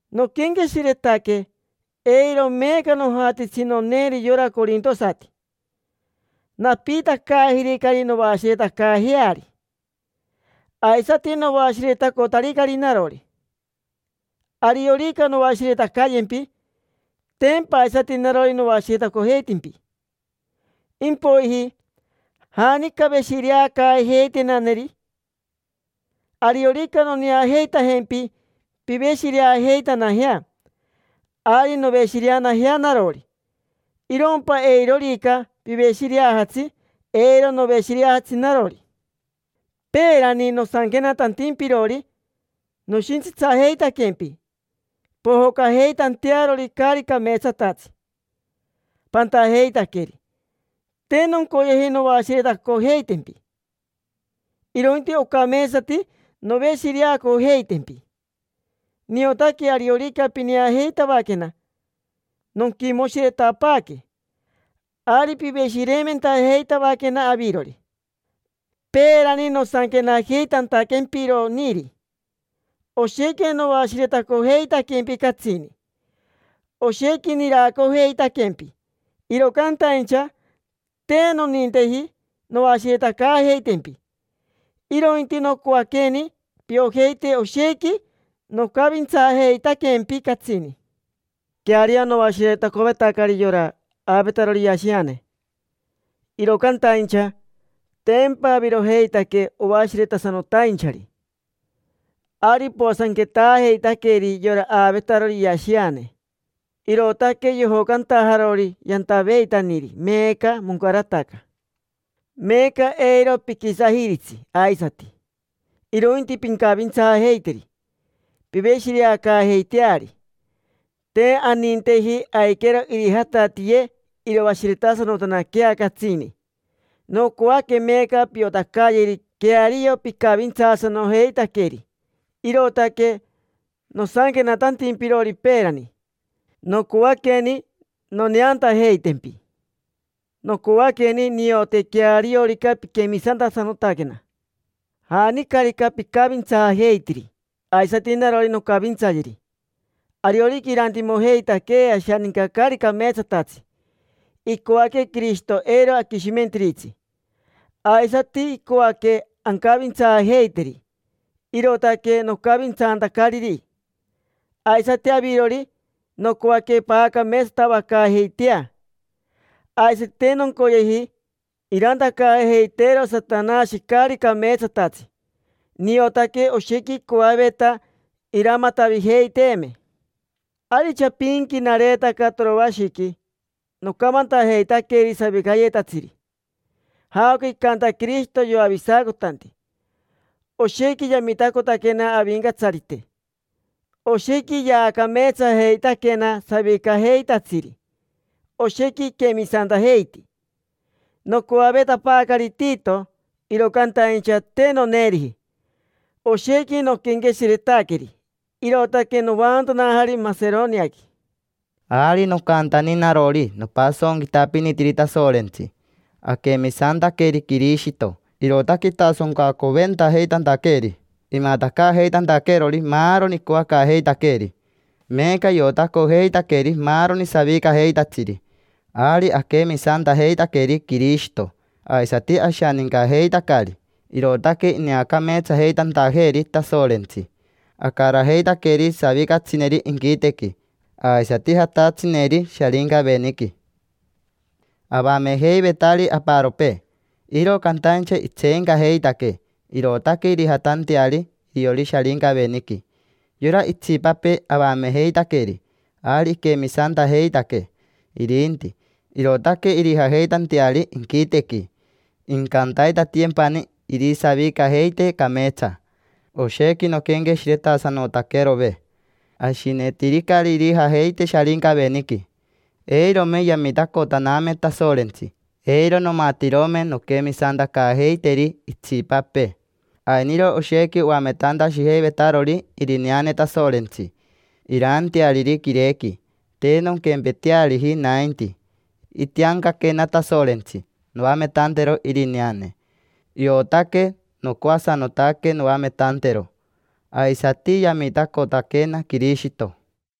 Noquenqueshiretaque: “Eiro meeca nojatitsi noneeri yora corintosati. Napiitacaajiricari noashiretacaajeari, aisati noashiretacotaricari narori”. Ariorica noashiretacayempi, tempa aisati narori noashiretacojeitempi. Impoiji, ¿janica veshireacaajeitenaneri? Ariorica noneajeitajempi piveshireajeitanajea, ari noveshireanajea narori. Irompa eirorica piveshireajatsi, eiro noveshireajatsi narori. Peerani nosanquenatantimpirori noshintsitsajeitaquempi pojocajeitantearori caari cameetsatatsi pantajeitaqueri. Te noncoyeji noashiretacojeitempi, irointi ocameetsati noveshireacojeitempi. Niotaque ariorica pineajeitavaquena nonquimoshiretapaaque, ari piveshireimentajeitavaquena avirori. Peerani nosanquenajeitantaquempironiri, oshequi noashiretacojeitaquempi catsini, oshequi niracojeitaquempi. Iro cantaincha te noninteji noashiretacaajeitempi, irointi nocoaqueni piojeite oshequi nocavintsaajeitaquempi catsini. Queario noashiretacovetacari yora aavetarori iashiane, iro cantaincha tempa avirojeitaque oashiretasanotainchari. Ari poasanquetaajeitaqueri yora aavetarori iashiane, irootaque yojocantajarori yantaveitaniri, meeca moncarataca. Meeca eiro piquisajiritsi aisati, irointi pincavintsaajeiteri. Piveshireacaajeiteari, te aninteji aiquero irijatatiiye iroashiretasanotanaquea catsini. Nocoaque meeca piotacayeri queario picavintsaasanojeitaqueri. Irootaque nosanquenatantimpirori peerani: nocoaqueni noneantajeitaquempi. Nocoaqueni niote queariorica piquemisantasanotaquena. Janicarica picavintsaajeitiri, aisati narori noncavintsayeri. Ariorica irantimojeitaquee ashaninca caari cameetsatatsi, icoaque Quirishito eiro aquishimentiritsi, aisati icoaque ancavintsaajeiteri. Irootaque nocavintsantacariri. Aisati avirori, nocoaque paacameetsatavacaajeitea. Aisati te noncoyeji irantacaajeiteero Satanashi caari cameetsatatsi. Niotaque oshequi icoaveta iramatavijeiteeme. Ari chapinqui nareetaca Toroashiqui, nocamantajeitaqueri savicayetatsiri jaoca icanta Quirishito yoavisacotanti. Oshequi yamitacotaquena Avincatsarite, oshequi yaacameetsajeitaquena savicajeitatsiri, oshequi iquemisantajeiti. Nocoavetapaacari Tito, iro cantaincha te noneeriji. Oshequi noquenqueshiretaqueri, irootaque novaantanajari Maseroniaqui. Ari nocantani narori nopasonquitapinitiri Tasorentsi. Aquemisantaqueri Quirishito, irootaque itasoncacoventajeitantaqueeri, imatacaajeitantaqueerori maaroni icoacaajeitaqueeri. Meeca iotacojeitaqueri maaroni savicajeitatsiri. Ari aquemisantajeitaqueri Quirishito, aisati ashanincajeitacari, irootaque ineacameetsajeitantajeeri Tasorentsi. Acarajeitaqueri savicatsineri inquitequi, aisati jatatsineri Sharincaveniqui. Avamejeivetari aparopee, iro cantaincha itseencajeitaquee, irootaque irijatanteari iriori Sharincaveniqui. Yora itsipapee avamejeitaqueri, ari iquemisantajeitaquee irinti, irootaque irijajeitanteari inquitequi. Incantaitatiyempani irisavicajeite cameetsa. Oshequi noquenqueshiretasanotaquerove: ashinetiricari irijajeite Sharincaveniqui. Eirome yamitacotaname Tasorentsi, eiro nomatirome nonquemisantacaajeiteri itsipapee. Ainiro oshequi oametantashijeivetarori irineane Tasorentsi iraanteariri quirequi. Te nonquempeteariji nainti. Itiancaquena Tasorentsi noametantero irineane, iotaque nocoasanotaque noametantero. Aisati yamitacotaquena Quirishito.